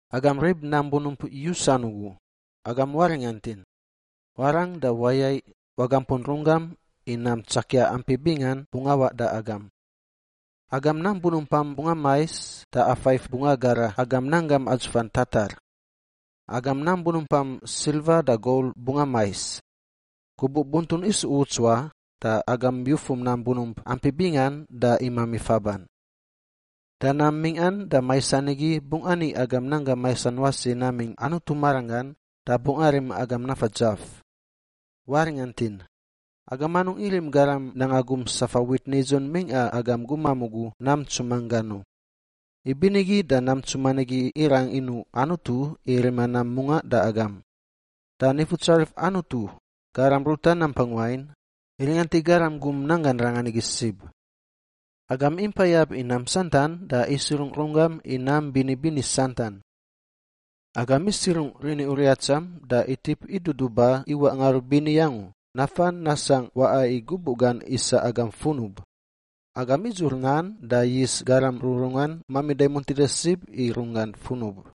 Agam rib nam bunump yusan ugu, agam waringantin! Warang da wayaiꞌ wagampun runggam i nam tsakia ampi bingan bungꞌ awaꞌ da agam. Agam nam bunumpam bungꞌ amais da afaif bungꞌ agara agam nanggam atsufan tatar. Agam nam bunumpam silva da gol bungꞌ amais. Gubuꞌ buntun isu uts wa da agam yufum nam bunump ampi bingan da imami faban. Da nam mingꞌan da maisan igi bungꞌ ani agam nanggam maisan wasi namingꞌ Anutu maranggan da bungꞌ arim agam nafa dzaf. Waringantin! Agam anungꞌ irim garam nanga gum safa wit nidzun mingꞌa agam gumam ugu nam ntsuman gan u. Ibinigi da nam ntsuman igi irang inuꞌ Anutu i rima nam mungaꞌ da agam. Da Nifutsarif Anutu, Garam ruta nampang wain, iringant i garam gum nanggan rangan igi sib. Agam impa iyab i nam santan da isirungꞌ runggam i nam bini bini santan. Agam isirungꞌ rini uriatsam da itip iduduba iwaꞌ ngarubini angu nafa nasangꞌ waꞌa i gubuꞌ gan isa agam funub. Agam idzur nan da yis garam rururungan mamida i muntida sib i runggan funub.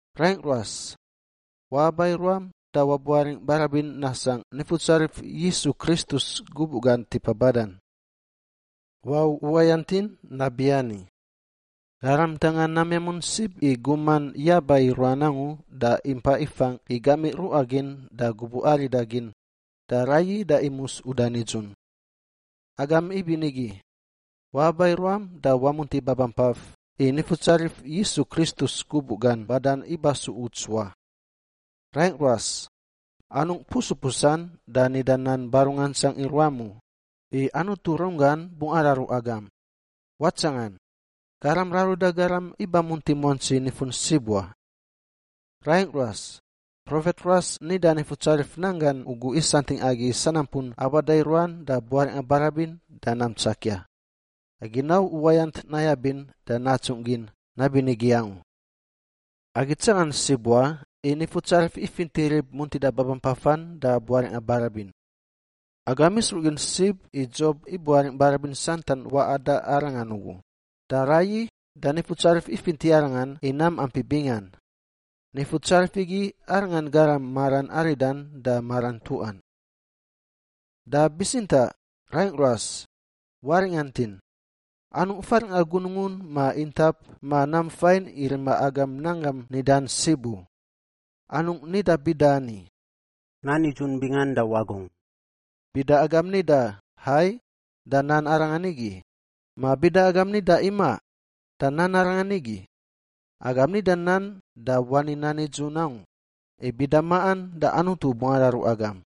Raingꞌ ruas, waaba i ruam da wabuaringꞌ barabin nasangꞌ Nifutsarif Yisu Kristus gubuꞌ gan tipa badan. Wau uwayantin nabiani, garam ntanga nam yamun sib i guman yaba i ruan angu da impa ifangꞌ i gamiꞌ ruꞌa gin da gubuꞌ arida gin, da raiyi da imus uda nidzun. Agam ibinigi, waaba i ruam da wamunti babampaf, i Nifutsarif Yisu Kristus gubuꞌ gan badan iba su uts wa. Raingꞌ ruas, anungꞌ pusupusan da nida nan barungantsang i ruam u, i Anutu runggan bungꞌ araru agam. Watsangan, Garam raruda garam iba munti muantsi nifun sib wa. Raingꞌ ruas, profet ruas nida Nifutsarif nan gan ugu isantingꞌ agi i sanampun abada i ruan da buaringꞌa barabin da nam tsakia. Agi nau uwayant nayabin da natsungꞌ gin nabinigi angu. Agi tsangan sib wa i Nifutsarif ifinti rib muntida babampafan da buaringꞌa barabin. Agam isruꞌ gin sib i Dzob ibuaringꞌ barabin santan waꞌa da arangan ugu, da raiyi da Nifutsarif ifinti arangan i nam ampi bingan. Nifutsarif igi Arangan Garam maran aridan da maran ntuꞌan. Da bitsintaꞌ, raingꞌ ruas, waringantin! Anungꞌ faringꞌa gunungun ma intap ma nam fain i rima agam nan gam nidan sib u. Anungꞌ nida bida ani, “Nan nidzun bingan da wagungꞌ.” Bida agam nida, “Hai,” da nan arangan nigi, ma bida agam nida, “Imaꞌ,” da nan arangan nigi. Agam nida nan da wani nan nidzun angu, i bida maꞌan da Anutu bungꞌ araru agam.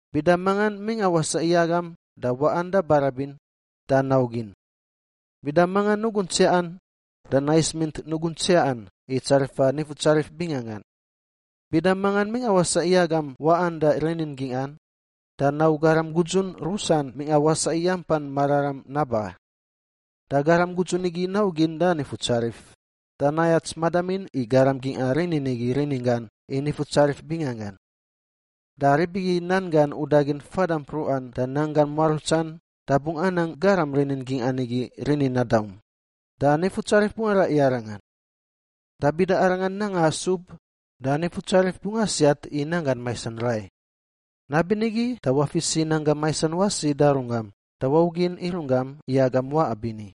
Bida mangan mingꞌa wasaꞌ i agam da waꞌan da barabin, da naugin. Bida mangan nugun tsiaꞌan da nais mint nugun tsiaꞌan i tsarifa Nifutsarif binganggan. Bida mangan mingꞌa wasaꞌ i agam waꞌan da rinin gingꞌan, da nau garam gudzun rusan mingꞌa wasaꞌ i ampan mararam naba. Da garam gudzun igi naugin da Nifutsarif, da nayats madamin i garam gingꞌa rinin igi rininggan i Nifutsarif binganggan. Da rib igi nan gan udagin fada mpruꞌa da nanggan muarutsan da bungꞌ anang garam rinin gingꞌan igi rinin nadaum, da Nifutsarif bungꞌ araꞌ i arangan. Da bida arangan nanga asub, da Nifutsarif bungꞌ asiat i nanggan maisan rai. Nabinigi da wafis i nanggam maisan wasi da runggam da waugin i runggam i agam waꞌa bini.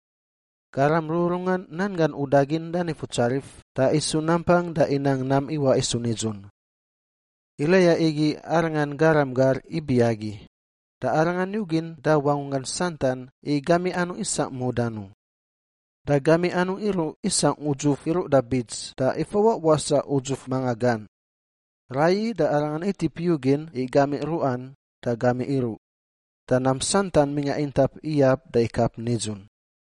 Garam rururungan nan gan udagin da Nifutsarif da isu nampang da inang nam iwaꞌ isu nidzun. Eliya igi arangan garam gar ibi agi, da arangan yugin da wangunggan santan i gamiꞌ anungꞌ isangꞌ mudan u. Da gamiꞌ anungꞌ iruꞌ isangꞌ udzuf iruꞌ da bits da ifawaꞌ wasaꞌ udzuf manga gan. Raiyi da arangan itip yugin i gamiꞌ ruꞌan da gamiꞌ iruꞌ, da nam santan mingꞌa intap iyab da ikap nidzun.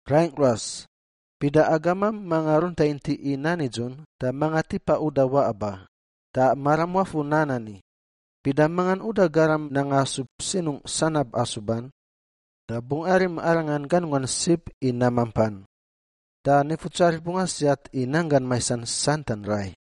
Raingꞌ ruas, bida agamam manga runta intiꞌ i nan nidzun, da manga tipa uda waꞌa ba, da maram wafur nan ani, bida mangan uda garam nanga asub sinungꞌ sanab asuban, da bungꞌ arim arangan ganunggan sib i nam mampan. Da Nifutsarif bungꞌ asiat i nanggan maisan santan rai.